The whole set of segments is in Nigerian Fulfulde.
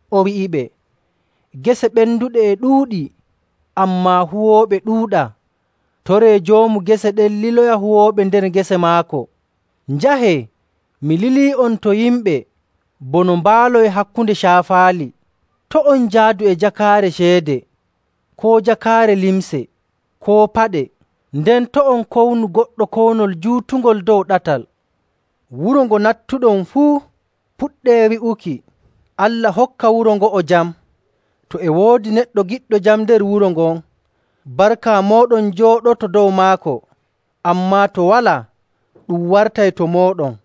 O wi'iɓe, “Gese ɓenduɗe e ɗuuɗi, ammaa huwooɓe ɗuuɗaa. Toree Joomu gese ɗen liloya huwooɓe nder gese maako.. Njahee. Mi lilii'on to yimɓe bono mbaaloy hakkunde caafaali.. To' on njaadu e jakaare ceede koo jakaare limce, koo paɗe, nden to' on kownu goɗɗo kownol juutungol dow ɗatal. Wuro ngo nattuɗon fuu, puɗɗee wi'uki, ‘Allah hokka wuro ngo'o jam!’ To e woodi neɗɗo giɗɗo jam nder wuro ngon, barka mooɗon jooɗoto dow maako, ammaa to walaa, ɗum wartay to mooɗon.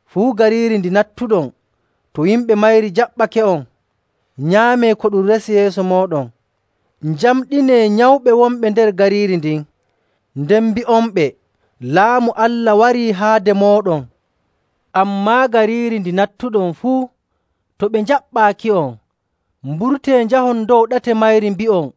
Fuu gariiri ndi nattuɗon, to yimɓe mayri njaɓɓake'on, nyaamee ko ɗum resi yeeso mooɗon. Njamɗinee nyawɓe wonɓe nder gariiri ndin, nden mbi'onɓe, ‘Laamu Allah warii haade mooɗon.’ Ammaa, gariiri ndi nattuɗon fuu, to ɓe njaɓɓaaki'on, mburtee njahon dow ɗate mayri mbi'on,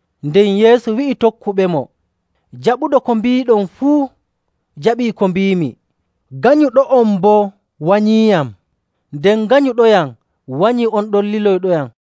Nden Yeesu wi'i tokkuɓemo, “Jaɓuɗo ko mbiiɗon fuu jaɓii ko mbiimi, ganyuɗo'on boo wanyiiyam, nden ganyuɗoyam wanyii on ɗon liloyɗoyam.”.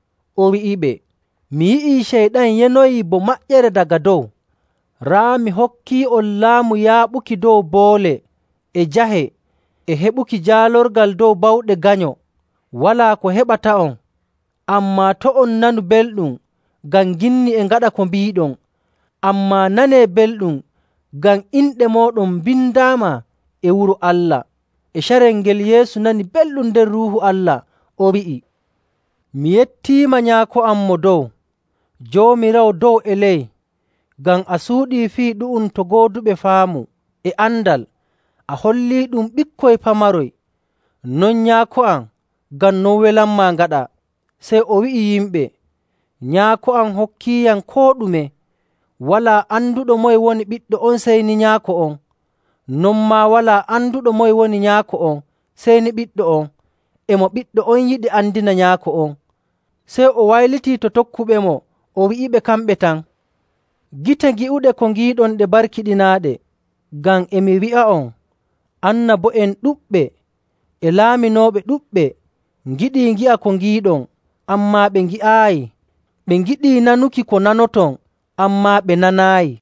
O wi'iɓe, “Mi yi'ii Ceyɗan yanoyii bo maƴƴere daga dow. Raa, mi hokkii'on laamu yaaɓuki dow boole e jahe e heɓuki jaalorgal dow bawɗe Ganyo, walaa ko heɓata'on.. Ammaa to' on nanu belɗum ngam ginni e ngaɗa ko mbiiɗon, ammaa nanee belɗum ngam inɗe mooɗon mbindaama e wuro Allah.” E carel ngel, Yeesu nani belɗum nder Ruuhu Allah, o wi'i, “Mi yettiima, Nyaako am Mo Dow, Joomiraawo dow e ley, ngam a suuɗii fii ɗu'um to gooduɓe faamu e andal, a holliiɗum ɓikkoy pamaroy. Non Nyaako am, ngam non welanmaa ngaɗaa.” Sey o wi'i yimɓe, “Nyaako am hokkiiyam koo ɗume. Walaa anduɗo moye woni Ɓiɗɗo on sey ni Nyaako on, non maa walaa anduɗo moye woni Nyaako on sey ni Ɓiɗɗo on, e mo Ɓiɗɗo on yiɗi andina Nyaako on.”. Sey o waylitii to tokkuɓemo o wi'iɓe kamɓe tan, “Gite gi'uɗe ko ngiiɗon ɗe barkiɗinaaɗe! Ngam e mi wi'a'on, annabo'en ɗuɗɓe e laaminooɓe ɗuɗɓe ngiɗii ngi'a ko ngiiɗon, ammaa ɓe ngi'aayi. Ɓe ngiɗii nanuki ko nanoton, ammaa ɓe nanaayi.”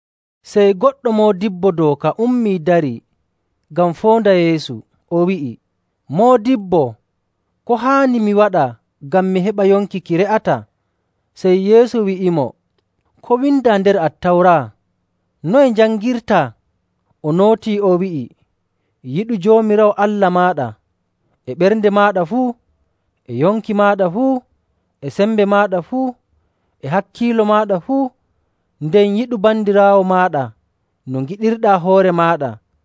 Sey goɗɗo moodibbo dooka: Waato lawyaajo. ummii darii ngam foonda Yeesu, o wi'i, “Moodibbo, ko haani mi waɗa ngam mi heɓa yonki ki re'ataa?” Sey Yeesu wi'imo, “Ko windaa nder Attawra? Noye njangirtaa?” O nootii, o wi'i, “ ‘Yiɗu Joomiraawo Allah maaɗa e ɓernde maaɗa fuu, e yonki maaɗa fuu, e sembe maaɗa fuu, e hakkiilo maaɗa fuu,’ nden, ‘Yiɗu bandiraawo maaɗa no ngiɗirɗaa hoore maaɗa.’”.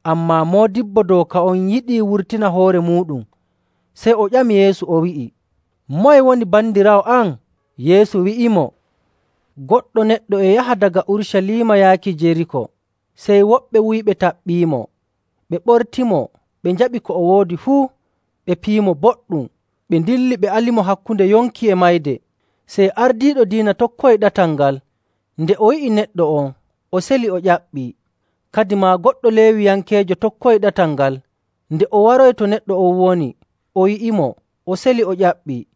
Ammaa moodibbo dooka on yiɗii wurtina hoore muuɗum, sey o ƴami Yeesu, o wi'i, “Moye woni bandiraawo am?” Yeesu wi'imo, “Goɗɗo neɗɗo e yaha daga Urucaliima yaaki Jeriiko, sey woɓɓe wuyɓe taɓɓiimo. Ɓe ɓortimo, ɓe njaɓi ko o woodi fuu, ɓe piyimo boɗɗum, ɓe ndilli, ɓe alimo hakkunde yonki e mayde. Sey ardiiɗo diina tokkoyi ɗatal ngal. Nde o yi'i neɗɗo on, o seli, o ƴaɓɓii. Kadimaa, goɗɗo Leewiyankeejo tokkoyi ɗatal ngal, nde o waroyi to neɗɗo on woni, o yi'imo, o seli, o ƴaɓɓii.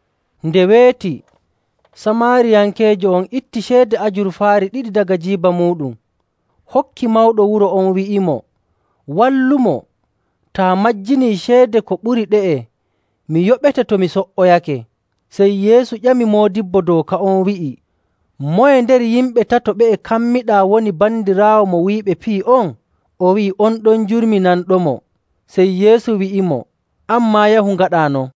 Nde weeti, Samaariyankeejo on itti ceede ajurfaari ɗiɗi daga jiiba muuɗum, hokki mawɗo wuro on wi'imo, ‘Wallumo. Taa majjinii ceede ko ɓuri ɗe'e, mi yoɓete to mi so''oyake.’” Sey Yeesu ƴami moodibbo dooka on wi'i, “Moye nder yimɓe tato ɓe'e kammiɗaa woni bandiraawo mo wuyɓe piyi on?” O wi'i, “On ɗon jurminanɗomo.” Sey Yeesu wi'imo, “An maa, yahu ngaɗaa non.”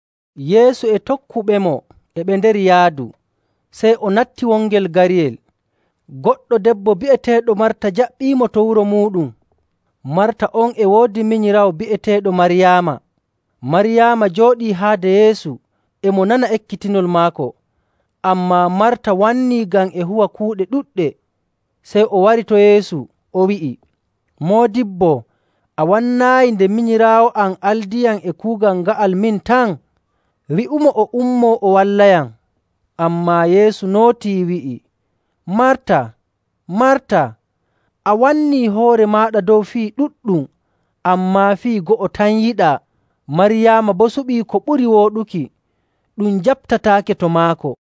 Yeesu e tokkuɓemo e nder yaadu, sey o natti wongel gariyel, goɗɗo debbo bi'eteeɗo Marta jaɓɓiimo to wuro muuɗum. Marta on e woodi minyiraawo bi'eteeɗo Maryaama. Maryaama jooɗii haade Yeesu e mo nana ekkitinol maako.. Ammaa Marta wannii ngam e huwa kuuɗe ɗuɗɗe. Sey o wari to Yeesu, o wi'i, “Moodibbo, a wannaayi nde minyiraawo am aldiyam e kuugal nga'al min tan? Wi'umo o ummoo o wallayam!” Ammaa Yeesu nootii, wi'i, “Marta, Marta, a wannii hoore maaɗa dow fii ɗuɗɗum. Ammaa fii go'o tan yiɗaa. Maryaama boo suɓii ko ɓuri wooɗuki, ɗum jaɓtataake to maako.”